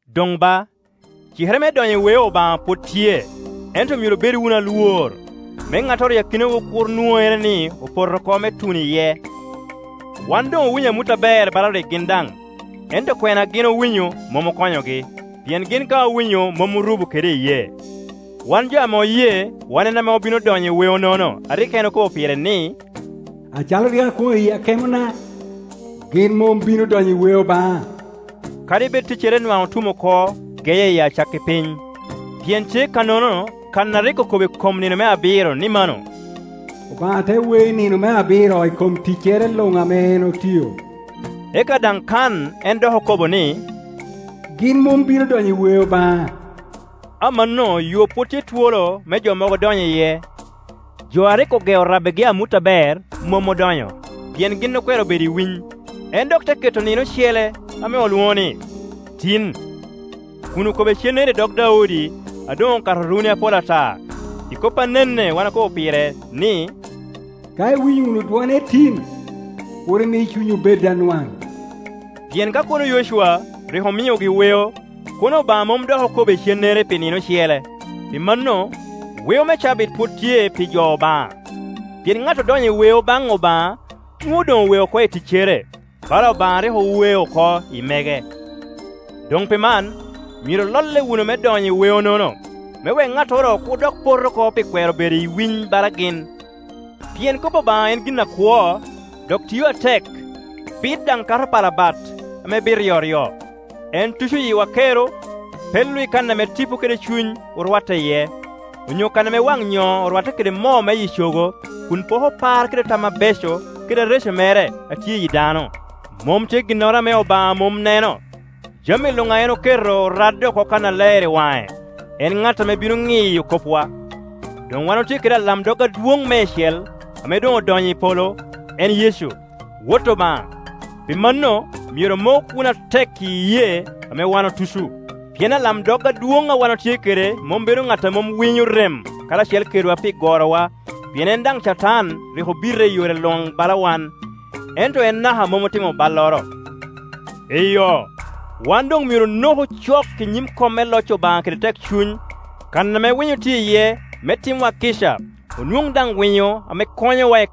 Doŋ ba, cikere me donyo i weo Obaŋa pwod tye, ento myero obed wunu alwor, me ŋattoro i akinawu kur nwoŋere ni opoto oko me tuno iye. Wan doŋ owinyo amut aber bala rik gin daŋ; ento kwena a gin owinyo mom okonyogi, pien gin ka owinyo mom orubo kede iyee. Wan jo ame oye wan en ame obino donyo i weonono a rik en okobo pire ni, “Acalo rik akwono i akemona, ‘Gin mom bino donyo i weo baŋa,’” kadi bed ticcere nwaŋ otum oko geye i acakki piny. Pien tye kannono kan a rik okobo i kom nino me abiro ni mano, “Obaŋa te weo i nino me abiro i kom ticcere luŋ ame en otio.” Eka daŋ kan en dok okobo ni, “Gin mom bino donyo i weo baŋa.” Amanno yo pwod tye twolo me jo mogo dony iye. Jo a rik ogeo rabbigi amut aber mom odonyo, pien gin okwero bedo i winy. En dok te keto nino ocele ame olwoŋo ni, “Tin,” kun okobo icennere i dog Daudi a doŋ okato runi apol ata, i kop anene wan okobo pire, ni, “Ka iwinyo wunu dwone tin, kur imi cunywu bed anwaŋ.” Pien ka kono Yocwa rik omiogi weo, kono Obaŋa mom dok okobo icennere pi nino ocele. Pi mano, weo me cabit pwod tye pi jo Obaŋa; pien ŋat odonyo i weo baŋ Obaŋa nwoŋo doŋ owe oko i ticcere, bala Obaŋa a rik owe oko i mege. Doŋ pi man, myero ololle wunu me donyo i weo-nono, me wek ŋattoro kur dok pot oko pi kwero bedo i winy bala gin. Pien kop Obaŋa en gin akwo, dok tio atek, bit daŋ kato pala bat ame bit ryoryo. En tuco yiwa kero, pello i kan ame tipo kede cuny orwatte iye, onyo kan ame wan nyoo orwatte kede moo miyi cogo, kun poko par kede tam abeco kede areco mere a tye i yi dano. Mom tye ginnoro ame Obaŋa mom neno; jami luŋ a en oketo oradde oko kannaler i waŋe, en ŋat ame bino ŋiyo kopwa. Doŋ wan otye kede alamdog adwoŋ meicel ame doŋ odonyo i polo, en Yecu, Wot Obaŋa; pi mano myero omok wunu atek i iyee ame wan otuco. Pien alamdog adwoŋ a wan otye kede mom bedo ŋat a mom winyo rem karacel kedwa pi gorowa, pien en daŋ Catan rik obite i yore luŋ bala wan, ento en naka mom otimo balloro. Eyo, wan doŋ myero onoku cok i nyim kom me loc Obaŋa kede tekcuny, kan ame winyo tye iye, me timwa kica, onwoŋ daŋ winyo ame konyowa